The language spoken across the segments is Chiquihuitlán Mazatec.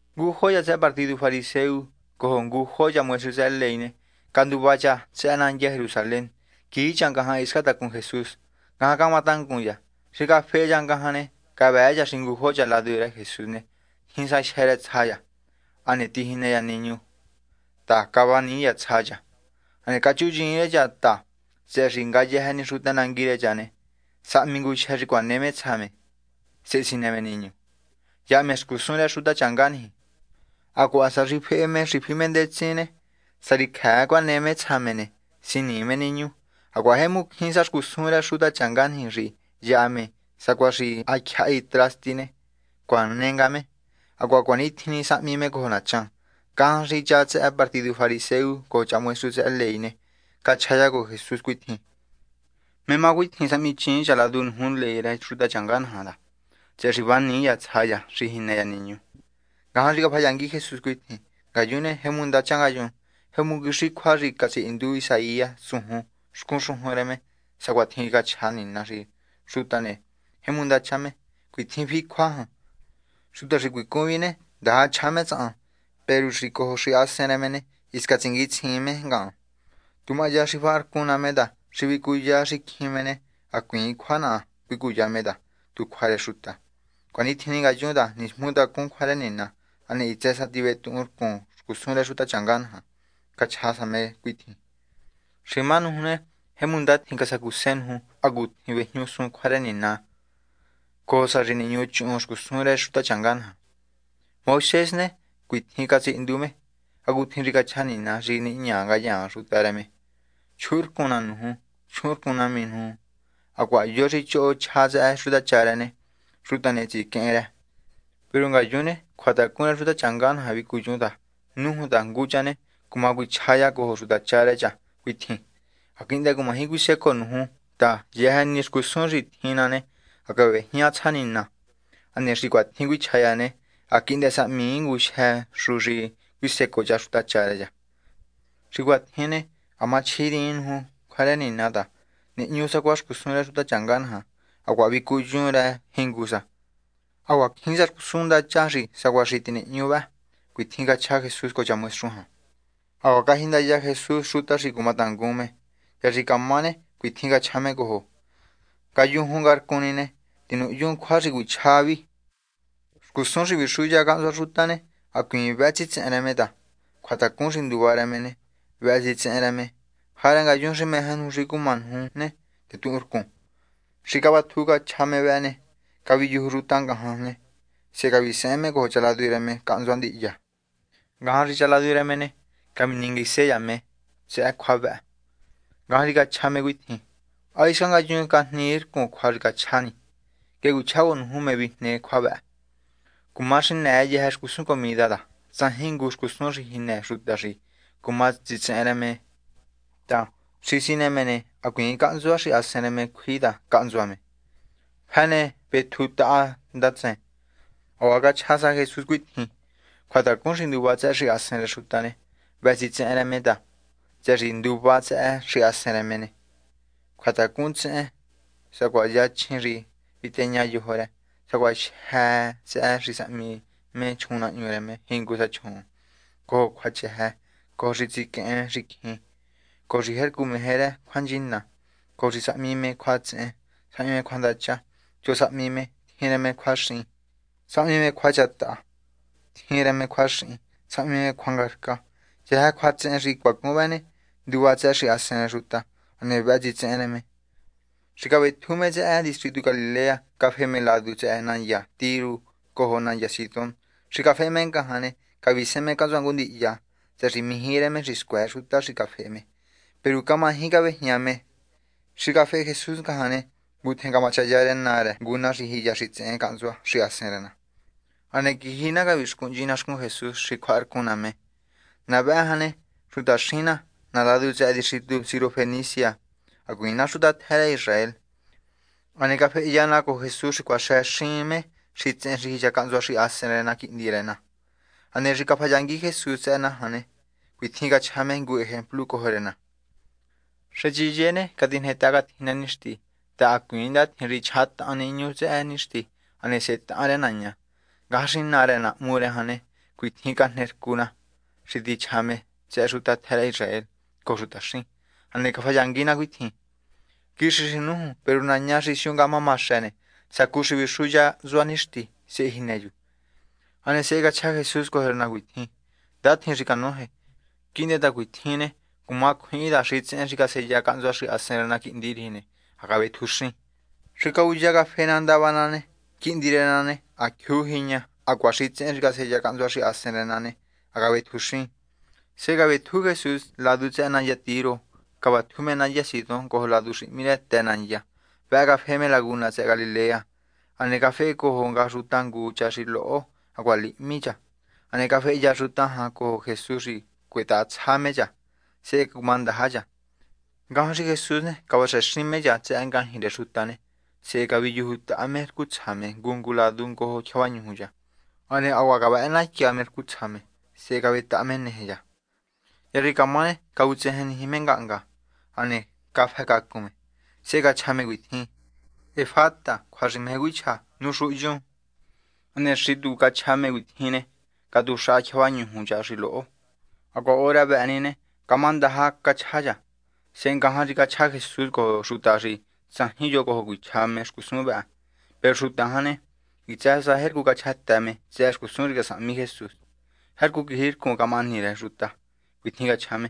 Ngujo cha tsëhë partidu fariseo cojo ngujo cha maestru tsëhë ley ne canduva cha tsëhë nandya Jerusalén quiji cha ngajan hiscan tacun Jesús, ngajan camatangun cha. Xi cafehe cha ngajan ne, cavëë cha xi ngujo cha ladu rë Jesús ne tjin sa jyë́ rë tsja cha ne, tijinë cha niñu ta cavanii cha tsja cha. Hane cachuyiin rë cha ta tsëhë xi ngayëjë ni xuta nangui niji ne, sahmi ngujyë xi cuane me tsja me sehe sinë me niñu. Yaha me xcusun rë xutachanga niji. Hacuaha hisca sa xi fehe me xi fi me ndetsin ne, sá xi cjëë cuane me tsja me ne, sinii me niñu. Hacuaha jemu cjín sa xcusun rë xutachanga niji xi yaha me ta sacuaha xi ha tyjahi trasti ne, cuane nga me. Hacuaha cuanitjin sahmi me cojo nachan. Ngajan xi cha tsëhë partidu fariseo cojo cha maestru tsëhë ley ne, cachja cha cojo Jesús cuitjin: ―¿Mé má cuatjin sahmiichiin cha ladu nuju ley rë xutachanga naja? ta, tsëhë xi vanii cha tsja cha xi jinë cha niñu. Ngajan xi cafayangui Jesús cuitjin: ―Ngayun ne, jo xcun jo ntsuvun yun. Jemu quixi cjua xi catsihindu Isaías tsujun xcun xujun rë me sacuatjin cachja Nina xi xuta ne, jemu ndacha me. Cuitjin fi cjua jan: Xuta xi cuicun vi ne, ndaja chja me tsahan, peru xi cojo xahasen rë me ne, hisca tsinguitsjiin me ngahan. Tu mahya xi faharcun ná me ta xi vicuya xicjin me ne, hacuiin cjua naha cuicuya me ta, tu cjua rë xuta. Cuanitjin ngayun ta nismutacun cjua rë Nina, hane hitsë sa tivetuhunrcun xcusun rë xutachanga naja. Cachja sa me cuitjin: ―Xi má nuju ne, jemu ndatjin casacuse nuju hacutjin vejñuxun cjua rë Nina cojo sa xi nihñuchuhun xcusun rë xutachanga naja. Moisés ne, cuitjin catsihindu me hacutjin xi cachja Nina xi nihña ngayaan xuta rë me: “Chjuhunrcun ná nuju, chjuhunrcun nahmi nuju”, hacuaha: “Yo xi choho chja tsëhë xutacha rë ne, xuta ne tsiquehen rë.” Peru ngayun ne, cjuatacun rë xutachanga naja vicuyun ta, nújun ta ngu cha ne cuma cuichja cha cojo xutacha rë cha cuitjin: “Ha quihndë cumaji cuisecoo nuju ta yëjë ni xcusun xi tjin ná ne, ha cavejñá tsja Nina.” Hane xi cuatjin cuichja cha ne, ha quihndë sahmii ngujyë xu xi cuisecoo cha xutacha rë cha. Xi cuatjin ne, ha camachjiriin nuju cjua rë Nina ta, nihñu sacuaha xcusun rë xutachanga naja, hacuaha vicuyun rë jingu sa. Hacuaha cjín sa xcusun ndacha sacuaha vëhë nihñu. ―Cuatjin cachja Jesús cojo maestru jan. Hacuaha cajindaya Jesús xuta xi cumatangun me. Hya xi camá ne cuitjin cachja me cojo: ―Ngayujun ngarcun ni ne, tinuhyun cjua xi cuichjá vi. Xcusun xi vixuya cahntsua xuta ne, hacuiin vëhë tsitsehen rë me ta, cjuatacun xi nduva rë me ne, vëhë tsitsehen rë me. Jarë ngayun xi meje nuju xi cumá nuju ne, tetuhunrcun. Xi cavatju cachja me vëhë ne, caviyuju xuta ngajan ne, sehe cavisehen me cojo cha ladu rë me cahntsua ndihya. Ngajan xi cha ladu rë me ne, cavinenguise cha me tsëhë cjua vëhë. Ngajan xi cachja me cuitjin: ―¿Há hisca ngayun cajnii rcun cjua xi cachjá ni? Nguehe cuichjá cojo nuju mé vijne cjua vëhë. Cuma xinëë yëjë xcusun comida ta tsajin ngu xcusun xi jinë xuta xi cuma tsitsehen rë me ta xi sinë me ne, hacuiin cahntsua xahasen rë me cjui ta cahntsua me. Fi ne vetjutaha ndatsen. Hacuaha cachja sa Jesús cuitjin: ―Cjuatacun xi nduva tsëhë xahasen rë xuta ne, vëhë tsitsehen rë me ta, tsëhë xi xi nduva tsëhë xahasen rë me ne, cjuatacun tsehen, sacuaha yachjin xi viteña yojo rë, sacuaha jyë́ tsëhë xi sahmi me chjuunnahñu rë me jingu sa chjuun, cojo cjuachëjë, cojo xi tsiquehen xicjin, cojo xi jercu meje rë me cjuanchina, cojo xi sahmi me cjuatsehen, sahmi me cjuandacha, choho sahmi me, tjin rë me cjuaxin, sahmi me cjuachjataha, tjin rë me cjuaxihin, sahmi me cjuangarca. Yëjë cjuatsehen xi cuacun vëhë ne, nduva tsëhë xahasen rë xuta, hane vëhë tsitsehen rë me. Xi cavetju me tsëhë distritu Galilea, cafe me ladu tsëhë nandya Tiro cojo nandya Sidón. Xi cafehe me ngajan ne, cavisehen me cahntsua ngu ndihya, tsëhë xi mijí rë me xi scuëë xuta xi cafehe me. Peru camaji cavejñahma me. Xi cafehe Jesús ngajan ne, ngutjen camachaya rë naa rë ngu na xi jiya xitsehen cahntsua xahasen rë na. Hane quiji na cavixcuhnchi na xcun Jesús xi cjuaharcun na me. Na vëhë jan ne, xutaxin na, na ladu tsëhë distritu Sirofenisia, hacuiin na xuta tjë rë Israel. Hane cafehya na cojo Jesús xi cuaxë me xitsehen xi jiya cahntsua xahasen rë na quihndi rë na. Hane xi cafayangui Jesús tsëhë na jan ne, cuitjin cachja me ngu ejemplu cojo rë na. ―Sechiye ni, catijnetaha catjinë nixti ta hacuiin ndatjin xi chjahatahan niñu tsëhë nixti hane sehe tahan rë naña. Ngajan xi naa rë na hmu rë jan ne, cuitjin cajnercu na xi tichja me tsëhë xuta tjë rë Israel cojo xutaxin. Hane cafayangui na cuitjin: ―Nai. Quixi xi nújun, peru naña xi siu ngahma maxë ne, sacu xi vixuhya hntsua nixti, sehe jinë chu. Hane sehe cachja Jesús cojo rë na cuitjin: ―Ndatjin xi canoje. Quihndë ta cuatjin ne, cuma cjuihin ta xitsehen xi caseya cahntsua xahasen rë na quihndi riji ne, ha cavetjuxin. Xi cavuya cafe na ndava na ne, quihndi rë na ne, ha jyuu jiña na hacuaha xitsehen xi caseya cahntsua xahasen rë na ne, ha cavetjuxin. Sehe cavetju Jesús ladu tsëhë nandya Tiro, cavatju me nandya Sidón cojo ladu xi hmí Të Nandya, vëhë cafehe me laguna tsëhë Galilea. Hane cafehecojo nga xuta ngu cha xi loho hacuaha lihmi cha. Hane cafehya xuta jan cojo Jesús xi cuetahatsja me cha, sehe cumandaja cha. Ngajan xi Jesús ne cavaxëxin me cha tsëhë ngajñi rë xuta ne, sehe caviyujutaha me rcu tsja me ngu ngu ladu ngojo tyjavañuju cha. Hane hacuaha cavëhënatya me rcu tsja me sehe cavetaha me neje cha. Hya xi camá ne, cavutsejenniji me ngahnga hane cafëcacun me. Sehe cachja me cuitjin: ―¡Efata! ―cjua xi meje cuichja: ¡Nuxuhunyun! Hane xi tu cachja me cuatjin ne, catuxaha tyjavañuju cha xi loho. Hacuaha hora vëhë ni ne, camá ndandaja cachja cha. Sehe ngajan xi cachja Jesús cojo xuta xi tsajin yo cuichja cojo me xcusun vëhë. Peru xuta jan ne, hitsë sa jercu cachjatë me tsëhë xcusun xi casahmi Jesús. Jercu quijircun camahani rë xuta. Cuitjin cachja me: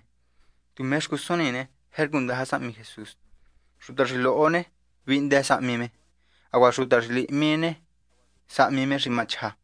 ―Tu mé xcusun ni jercu ndaja sahmi Jesús. Xuta xi loho ne, vihndë sahmi me, hacuaha xuta xi lihmi ne, sahmi me xi ma chja.